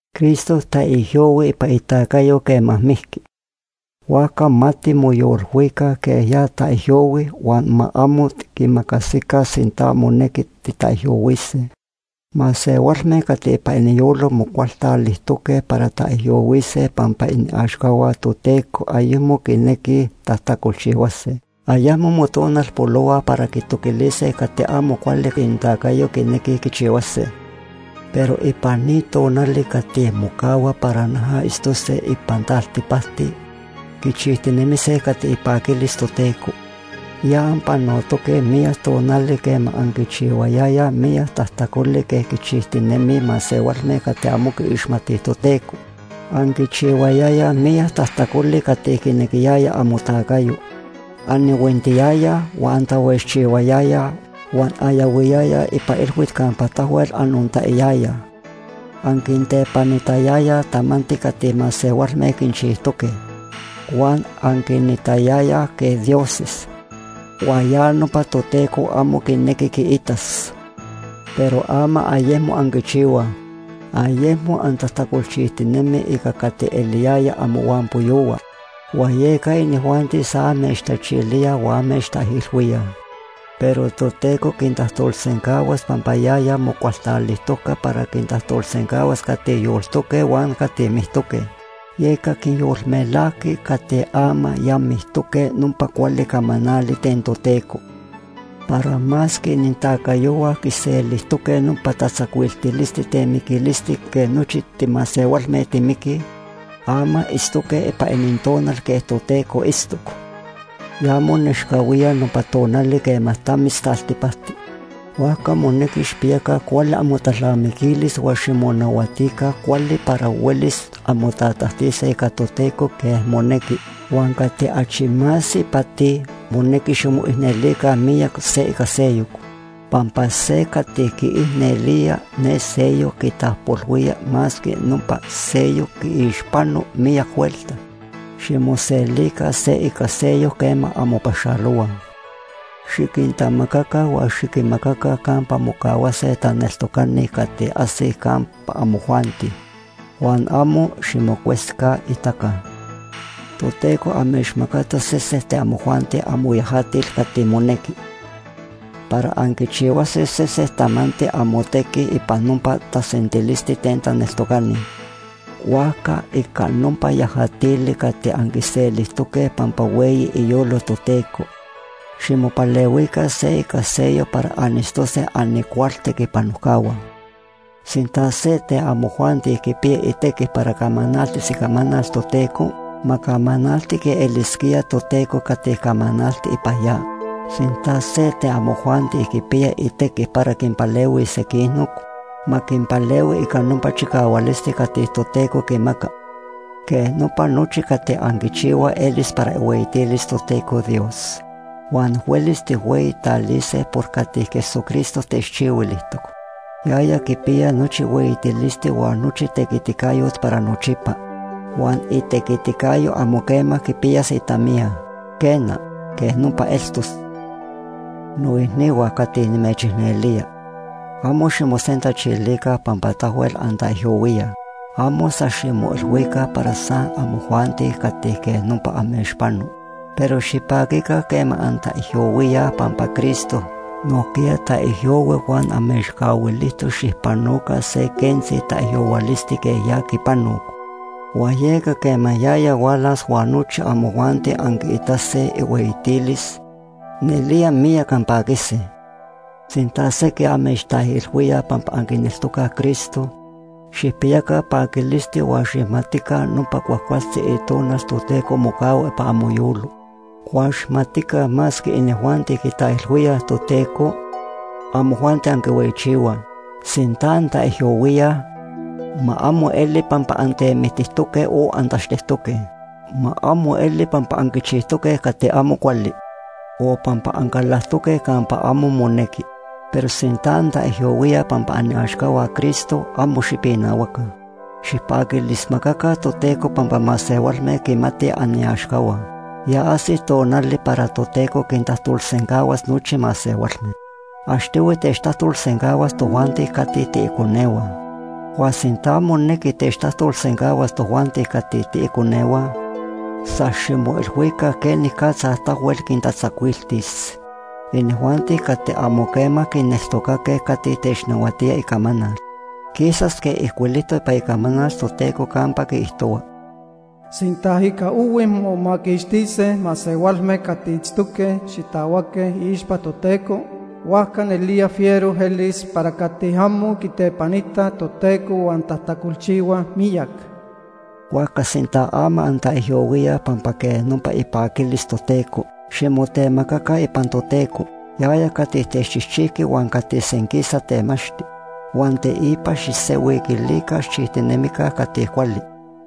Cristo taijyohui ipan itacayo quema mijqui, huajca ma timoyolilhuica quej ya taijyohui huan ma amo tiquimacasica sinta monequi titaijyohuise. Masehualme cati ipan iniyolo mocualtalijtoque para taijyohuise pampa iaxcahua Toteco ayecmo quinequij tajtacolchihuase. Ayecmo motonalpolohuaj para quitoquilise cati amo cuali inintacayo quinequij quichihuase. Pero ipan ni tonali cati mocahuaj para noja itztose ipan taltipacti, quichijtinemise cati ipaquilis Toteco. Ya anpanotoque miyac tonali quema anquichihuayayaj miyac tajtacoli quej quichijtinemij masehualme cati amo quiixmatij Toteco. Anquichihuayayaj miyac tajtacoli cati quinequiyaya amotacayo. Anihuintiyayaj, huan antahuejchihuayayaj, huan anyahuiyayaj ipan ilhuit campa tahuel anontaiyayaj. Anquintepanitayayaj tamanti cati masehualme quinchijtoque, huan anquinitayayaj quej dioses, huan ya nopa Toteco amo quinequi quiitas. Pero ama ayecmo anquichihuaj. Ayecmo antajtacolchijtinemij ica cati eliyayaj amohuampoyohua, huan yeca inijuanti san amechtachilíaj huan amechtaijilhuíaj. Pero Toteco quintajtolsencahuas pampa yaya mocualtalijtoc para quintajtolsencahuas cati yoltoque huan cati mictoque. Yeca quinyolmelajqui cati ama ya mictoque nopa cuali camanali ten Toteco para masque inintacayohua quiselijtoque nopa tatzacuiltilisti ten miquilisti quej nochi timasehualme timiquij, ama itztoque ipan inintonal quej Toteco itztoc. Ya monechcahuía nopa tonali quema tamis taltipacti. Huajca monequi xijpiyaca cuali amotalnamiquilis huan ximonahuatica cuali para huelis anmotatajtise ica Toteco quej monequi. Huan cati achi más ipati, monequi ximoicnelica miyac se ica seyoc, pampa se cati quiicnelía ne seyoc quitapojpolhuía masque nopa seyoc quiixpano miyac huelta. Ximoselica se ica seyoc quema anmopaxalohuaj. Xiquintamacaca huan xiquinmacaca campa mocahuase taneltocani cati ajsij campa amojuanti, huan amo ximocuesijcaitaca. Toteco amechmacatoc sese ten amojuanti amoyajatil cati monequi para anquichihuase sesen tamanti amotequi ipan nopa tasentilisti ten taneltocani. Huajca ica nopa yajatili cati anquiselijtoque pampa hueyi iyolo Toteco, ximopalehuica se ica seyoc para anitztose anicualtequipanojcahua. Sinta se ten amojuanti quipiya itequi para camanaltis icamanal Toteco, ma camanalti quej elisquía Toteco cati camanalti ipan ya. Sinta se ten amojuanti quipiya itequi para quinpalehuis sequinoc, ma quinpalehui ica nopa chicahualisti cati Toteco quimaca. Quej nopa nochi cati anquichihuaj elis para ihueyitilis Toteco Dios, huan huelis tijhueyitalise por cati Jesucristo techchihuilijtoc. Yaya quipiya nochi hueyitilisti huan nochi tequiticayot para nochipa. Huan itequiticayo amo quema quipiyas itamiya. Quena, quej nopa eltos. Noicnihua cati nimechicnelía, amo ximosentachilica pampa tahuel antaijyohuíaj. Amo san ximoilhuica para san amojuanti cati quej nopa amechpano. Pero xipaquica quema antaijyohuíaj pampa Cristo nojquiya taijyohui huan amechcahuilijtoc xijpanoca se quentzi taijyohuilisti quej ya quipanoc. Huan yeca quema yaya hualas huan nochi amojuanti anquiitase ihueyitilis, nelía miyac anpaquise. Sinta sequij amechtaijilhuíaj pampa anquineltocaj Cristo, xijpiyaca paquilisti huan xijmatica nopa cuajcualtzi Itonal Toteco mocahua ipan amoyolo. Huan xijmatica masque inijuanti quitaijilhuíaj Toteco, amojuanti anquihueyichihuaj. Sinta antaijyohuíaj, ma amo eli pampa antemictijtoque o antachtectoque. Ma amo eli pampa anquichijtoque cati amo cuali o pampa ancalactoque campa amo monequi. Pero sinta antaijyohuíaj pampa aniaxcahua Cristo, amo xipinahuaca. Xijpaquilismacaca Toteco pampa masehualme quimatij aniaxcahua. Ya ajsic tonali para Toteco quintajtolsencahuas nochi masehualme. Achtohui techtajtolsencahuas tojuanti cati tiiconehua. Huan sinta monequi techtajtolsencahuas tojuanti cati tiiconehua, san ximoilhuica quenicatza tahuel quintatzacuiltis inijuanti cati amo quema quineltocaque cati technahuatía icamanal. Quisas quej ijcuilijtoc ipan Icamanal Toteco campa quiijtohua: “Sinta ica ohui momaquixtise masehualme cati itztoque xitahuaque iixpa Toteco, huajca nelía fiero elis para cati amo quitepanitaj Toteco huan tajtacolchihuaj miyac.” Huajca sinta ama antaijyohuíaj pampa quej nopa ipaquilis Toteco, ximotemacaca ipan Toteco, yaya cati techchijchijqui huan cati senquisa temachti. Huan teipa xijsenhuiquilica xijchijtinemica cati cuali.